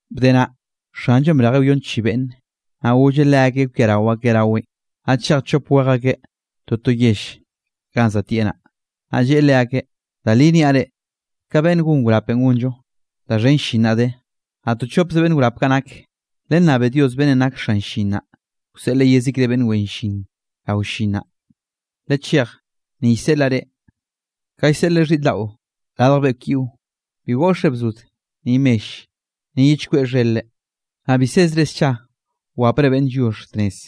Bde naꞌ, Xanllonꞌ brejeꞌ wyon chi beꞌnne, naꞌ golleꞌ leakeꞌ kwiarao akeꞌ raweꞌn, naꞌ chej chop wej akeꞌ toto yell ganꞌ za tieꞌ naꞌ. Naꞌ lleꞌe leakeꞌ: —Da li niaꞌ reꞌ, ka beꞌnn gon wrapenꞌ gonllo, da xhen llin naꞌ de, naꞌ to chopze beꞌnn wrap kaꞌ nak. Lennabe Dios beꞌnnenꞌ nak xan llin naꞌ, wseꞌleꞌ yezikre beꞌnn wen llin rao llin naꞌ. Lechej, ni llseꞌlaꞌ reꞌ, ka llseꞌleꞌ xhiꞌr daꞌo radj beꞌkw yiꞌo. Bi goꞌxre bzod ni mell, ni ye chkweꞌ xher-re, naꞌ bi sezre scha wapre beꞌnn lliox tnez.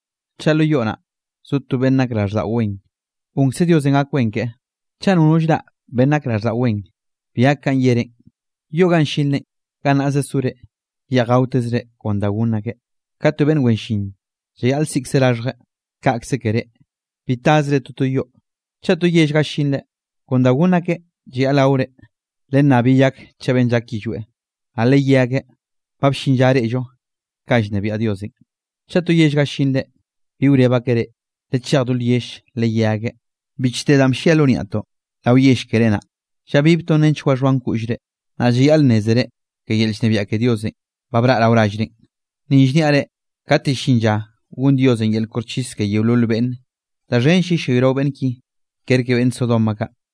Chaꞌ lo yoꞌ naꞌ zo to beꞌnn nak raꞌlldaꞌo wen, gonkze Diosenꞌ gak wen keꞌe. Chaꞌ nono llraꞌ beꞌnn nak raꞌlldaꞌo wen, bi gak kanꞌ yerenꞌ. Yoꞌ ga llinre, gannaꞌze sore, yeꞌj gaotezre kon da gonn akeꞌ. Ka to beꞌnn wen llin llayaꞌl siꞌkze raxhjeꞌ, kaꞌkze ke reꞌ; bi tasre toto yoꞌ. Chaꞌ to yell ga llinre, kon da gonn akeꞌ llayaꞌl gaore. Lennab yeyak chaꞌ beꞌnn llak yillweꞌ, naꞌ leyé akeꞌ: “Ba bllin lla reꞌllo kanꞌ llnebiaꞌ Diosenꞌ.” Chaꞌ to yell ga llinre bi wreb akeꞌ reꞌ, lechej do lyell, leyé akeꞌ: “Bichte danꞌ bllia lo niaꞌtoꞌn rao yell keré naꞌ, llabibtoꞌn nench waxhoan koꞌllre, naꞌ llayaꞌl nnézere ke yel llnebiaꞌ ke Diosenꞌ, ba braꞌ rao rallrenꞌ.” Ni llniaꞌ reꞌ, kate llin lla gon Diosenꞌ yel koxchis ke yeolol beꞌnne, da xhenll yellayrao beꞌnn ki, kerke beꞌnn Sodoma kaꞌ.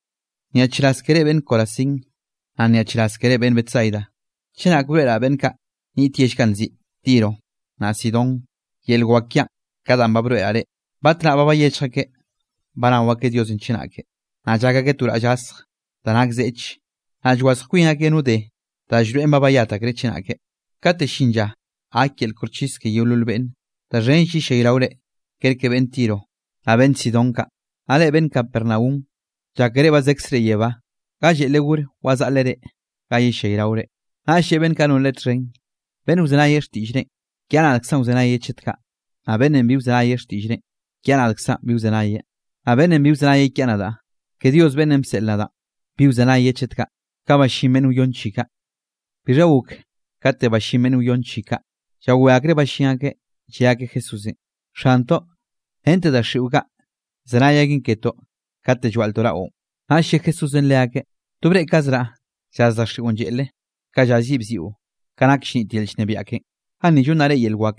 ’¡Nyaꞌchraz ke reꞌ beꞌnn Corazín! ¡Naꞌ nyaꞌchraz ke reꞌ beꞌnn Betsaida! Chenake broeꞌraꞌ beꞌnn kaꞌ niꞌt yell kaꞌ nziꞌi Tiro, naꞌ Sidón yel wak kiaꞌn ka danꞌ ba broeꞌraꞌ reꞌ, batnaꞌ ba bayechj akeꞌ banao akeꞌ Diosenꞌ chenake, naꞌ llak akeꞌ to raꞌll gasj da nak zeꞌch, naꞌ llwazj kwin akeꞌ no de da llroeꞌn ba bayat akreꞌ chenake. Kate llin lla gak yel koxchis ke yeolol beꞌnne, da xhenll yellayraore kerke beꞌnn Tiro, naꞌ beꞌnn Sidón kaꞌ. Naꞌ reꞌ beꞌnn Capernaum, llákere ba zekzre yebá, ga lleꞌle gor wazaꞌleꞌ reꞌ, ga yellayraore. Naꞌll lleꞌe beꞌnn kaꞌ non Leꞌe txhen: —Beꞌnn wzenayeꞌ xtiꞌllrenꞌ, kiaꞌ nadkzaꞌn wzenayeꞌ chet kaꞌ; naꞌ beꞌnnenꞌ bi wzenayeꞌ xtiꞌllrenꞌ, kiaꞌ nadkzaꞌn bi wzenayeꞌ. Naꞌ beꞌnnenꞌ bi wzenayeꞌ kiaꞌ nadaꞌ, ke Dios beꞌnnenꞌ bseꞌl nadaꞌn, bi wzenayeꞌ ke chet kaꞌ. Bixha gok kate ballín beꞌnn wyon chi kaꞌ, llawé akreꞌ ballín akeꞌ, lle akeꞌ Jesúsenꞌ: —¡Xantoꞌ, rente daxiꞌo kaꞌ, llzenay aken ketoꞌ kate llwaꞌltoꞌ raꞌon! Naꞌll lle Jesúsenꞌ leakeꞌ: —To breꞌkazraꞌ llaz daxiꞌon lleꞌle, ka llaz yiꞌ bziꞌo ka nak llnit yel llnebiaꞌ ken. Ganni llonnaꞌ reꞌ yel wak,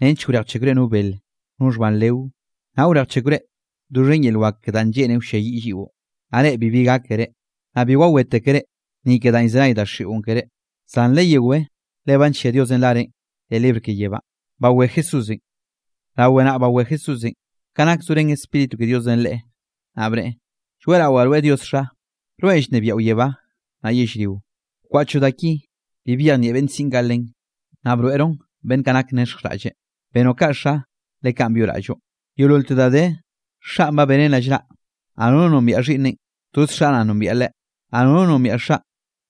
nench wrejchekwre no bele, no xhban leo, naꞌ wrejchekwre doxhen yel wak ke da lleꞌne wlliayiꞌ lliꞌo, naꞌ reꞌ bibi gákere. Naꞌ bi wawétekere, ni ke danꞌ llzenay daxiꞌon keré, zan leyewé le ba nllia Diosenꞌ rarenꞌ leꞌ libr keꞌen yebá. Rawe naꞌ bawé Jesúsenꞌ, ka nak zorén Spíritu ke Diosenꞌ Leꞌen, naꞌ bneꞌe: —Lloeꞌrawaꞌ rweꞌ Dios Xa, rweꞌn llnebiaꞌo yebá naꞌ yellrionꞌ, bkwaꞌchoꞌ da ki, bi byejnieꞌ beꞌnn siꞌn kaꞌ len, naꞌ broeꞌroꞌn beꞌnn nak nexjraꞌlle. Benoꞌ kaꞌ Xa, le kaꞌn byoꞌraꞌlloꞌ. ’Yeololte da de, Xaꞌn ba beneꞌn rallnaꞌ, naꞌ nono nombiaꞌ Xhiꞌnneꞌn, toz Xaꞌ naꞌ nombieꞌ Leꞌe, naꞌ nono nombiaꞌ Xaꞌn,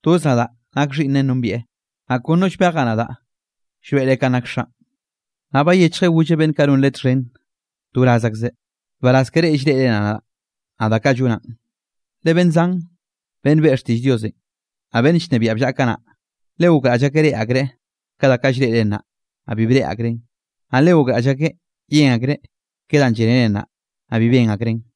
toz nadaꞌ nak Xhiꞌnneꞌ nombieꞌ, naꞌ kon no llbejaꞌ nadaꞌ llroeꞌreꞌ kanꞌ nak Xaꞌn. Naꞌ bayechjeꞌ golleꞌ beꞌnn kaꞌ non Leꞌe txhen to wraz akzeꞌ: —Nbaraz ke reꞌ llreꞌre nadaꞌ, naꞌ da kaꞌ llonaꞌn. Le beꞌnn zan beꞌnn beꞌe xtiꞌll Diosenꞌ, naꞌ beꞌnn llnebiaꞌ bllaꞌa kanaꞌ, le gokraꞌll akeꞌ reꞌe akreꞌ ka da kaꞌ llreꞌre nnaꞌ, naꞌ bi breꞌe akreꞌn; naꞌ le gokraꞌll akeꞌ yen akreꞌ ke danꞌ llénere nnaꞌ, naꞌ bi ben akreꞌn.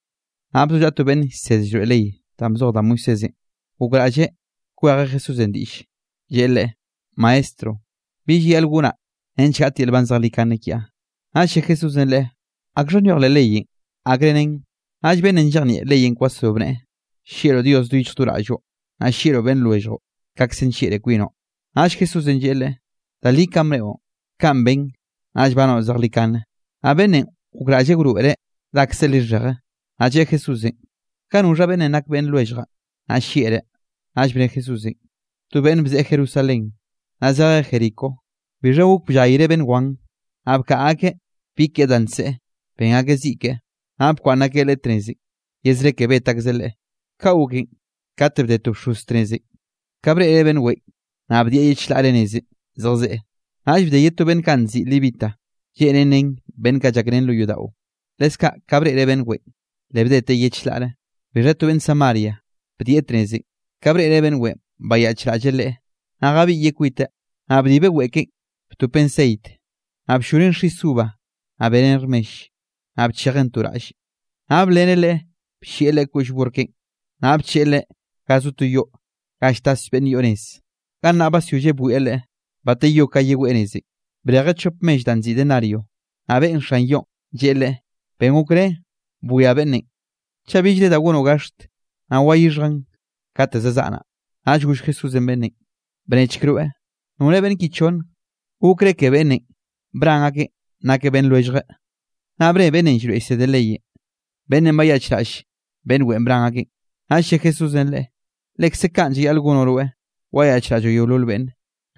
Naꞌ bzollaꞌa to beꞌnn llsed llroeꞌ ley danꞌ bzoj da Moisésenꞌ, gokraꞌlleꞌ kwejeꞌ Jesúsenꞌ diꞌlle, lleꞌe Leꞌe: —Maestro, ¿Bi llayaꞌl gonaꞌ nench gaꞌt yel nban zejlikane kiaꞌ? Naꞌll lle Jesúsenꞌ leꞌe: —¿Akxha nyoj leꞌ leyenꞌ? ¿Akre nen? Naꞌll beꞌnnenꞌ llejnieꞌ leyenꞌ kwasro bneꞌe: —“Llieꞌroꞌ Dios do yichj do raꞌlloꞌ, naꞌ llieꞌroꞌ beꞌnn lwelljoꞌ, kaꞌkze nllieꞌroꞌ kwinoꞌ.” Naꞌll Jesúsenꞌ lleꞌe leꞌe: —Da li kanꞌ bneꞌon, kaꞌn ben, naꞌll banoꞌ zejlikane. Naꞌ beꞌnnenꞌ, gokraꞌlleꞌ wroeꞌreꞌ dakze lixheje, naꞌ lleꞌe Jesúsenꞌ: —¿Ka noxha beꞌnnenꞌ nak beꞌnn lwelljaꞌn, naꞌ llieꞌreꞌ? Naꞌll bne Jesúsenꞌ: —To beꞌnn bzeꞌe Jerusalén, naꞌ zejeꞌ Jericó, bixha gok bllayreꞌ beꞌnn wan, naꞌ bkaꞌa akeꞌ bi keꞌe da nseꞌe, ben akeꞌ ziꞌ keꞌe, naꞌ bkwaꞌnn akeꞌ leꞌe tnezenꞌ ye zre ke bet akzeꞌ leꞌe. Kaꞌ goken, kate bde to bxoz tnezenꞌ, ka breꞌreꞌ beꞌnn weꞌen, naꞌ bdieꞌ ye chlaꞌre nezenꞌ zejzeꞌ. Naꞌll bde ye to beꞌnn kaꞌ nziꞌi levita, lleꞌnen nen beꞌnn llakrén lo yodaꞌo, leskaꞌ ka breꞌreꞌ beꞌnn weꞌen, le bdeteꞌ ye chlaꞌre. Bixha to beꞌnn Samaria, bdieꞌ tnezenꞌ; ka breꞌreꞌ beꞌnn weꞌen, bayaꞌchraꞌlleꞌ leꞌe. Naꞌ jabiꞌyeꞌ kwiteꞌ, naꞌ bdibeꞌ weꞌe keꞌen, btopeꞌn ceit, naꞌ blloneꞌn xis uva, naꞌ beneꞌn rmell, naꞌ bchejeꞌn to raꞌlle. Naꞌ bleneꞌ leꞌe bllieꞌ leꞌe koꞌll burr keꞌen, naꞌ bcheꞌe leꞌe ga zo to yoꞌ ga lltas beꞌnn yoꞌ nez. Gannaꞌ basyolleꞌ bwieꞌ leꞌe. Bateyó ka yeweꞌ nezenꞌ, brejeꞌ chop mell danꞌ nziꞌi denario, naꞌ beꞌen xan yoꞌn, lleꞌe leꞌe: “Ben gokre bwia beꞌnnenꞌ, chaꞌ billre da gonoꞌ gaxt, naꞌ wayixhjaꞌn kate zazaꞌa naꞌ.” Naꞌll goll Jesúsenꞌ beꞌnnenꞌ: —Bnechk rweꞌ, ¿nore beꞌnn ki chonne, gokreꞌ ke beꞌnnenꞌ bran akeꞌn nakeꞌ beꞌnn lwelljeꞌ? Naꞌ bne beꞌnnenꞌ llsed llroeꞌ leyenꞌ: —Beꞌnnenꞌ bayaꞌchraꞌll beꞌnn weꞌen bran akeꞌn. Naꞌll lle Jesúsenꞌ leꞌe: —Lekze kaꞌn llayaꞌl gonoꞌ rweꞌ, wayaꞌchraꞌlloꞌ yeolol beꞌnne.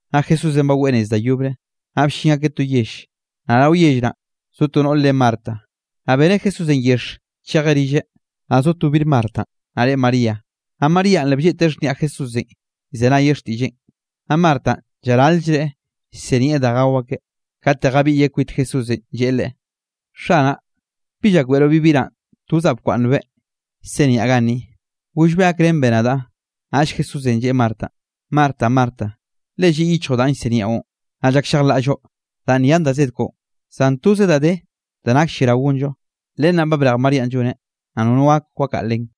Naꞌ Jesúsenꞌ baweꞌ nez da yobre, naꞌ bllin akeꞌ to yell, naꞌ rao yell naꞌ, zo to noꞌr re Marta, naꞌ beneꞌ Jesúsenꞌ yexh chejeꞌ rilleꞌ. Naꞌ zo to bir Martanꞌ, naꞌ re María, naꞌ Maríanꞌ le blleꞌteꞌ xhniaꞌ Jesúsenꞌ llzenayeꞌ xtiꞌlleꞌn. Naꞌ Martanꞌ llaral-llreꞌ llsinieꞌ da gao akeꞌ, kate jabiꞌyeꞌ kwit Jesúsenꞌ, lleꞌe Leꞌe: —Xanaꞌ, ¿bi llakbeꞌroꞌ bi biraꞌn tozaꞌ bkwaꞌnnbeꞌ, llsiniaꞌ ganni? Gollbeꞌ gakrenbeꞌ nadaꞌ. Naꞌll Jesúsenꞌ lleꞌe Martanꞌ: —Marta, Marta, le lliꞌ yichjoꞌ danꞌ llsiniaꞌon, naꞌ llakllejlaꞌlloꞌ danꞌ nyan da zed koꞌon. Zan toze da de da nak lliarao gonllo, len naꞌ ba brej Maríanꞌ lloneꞌ, naꞌ nono gak wakaꞌa len.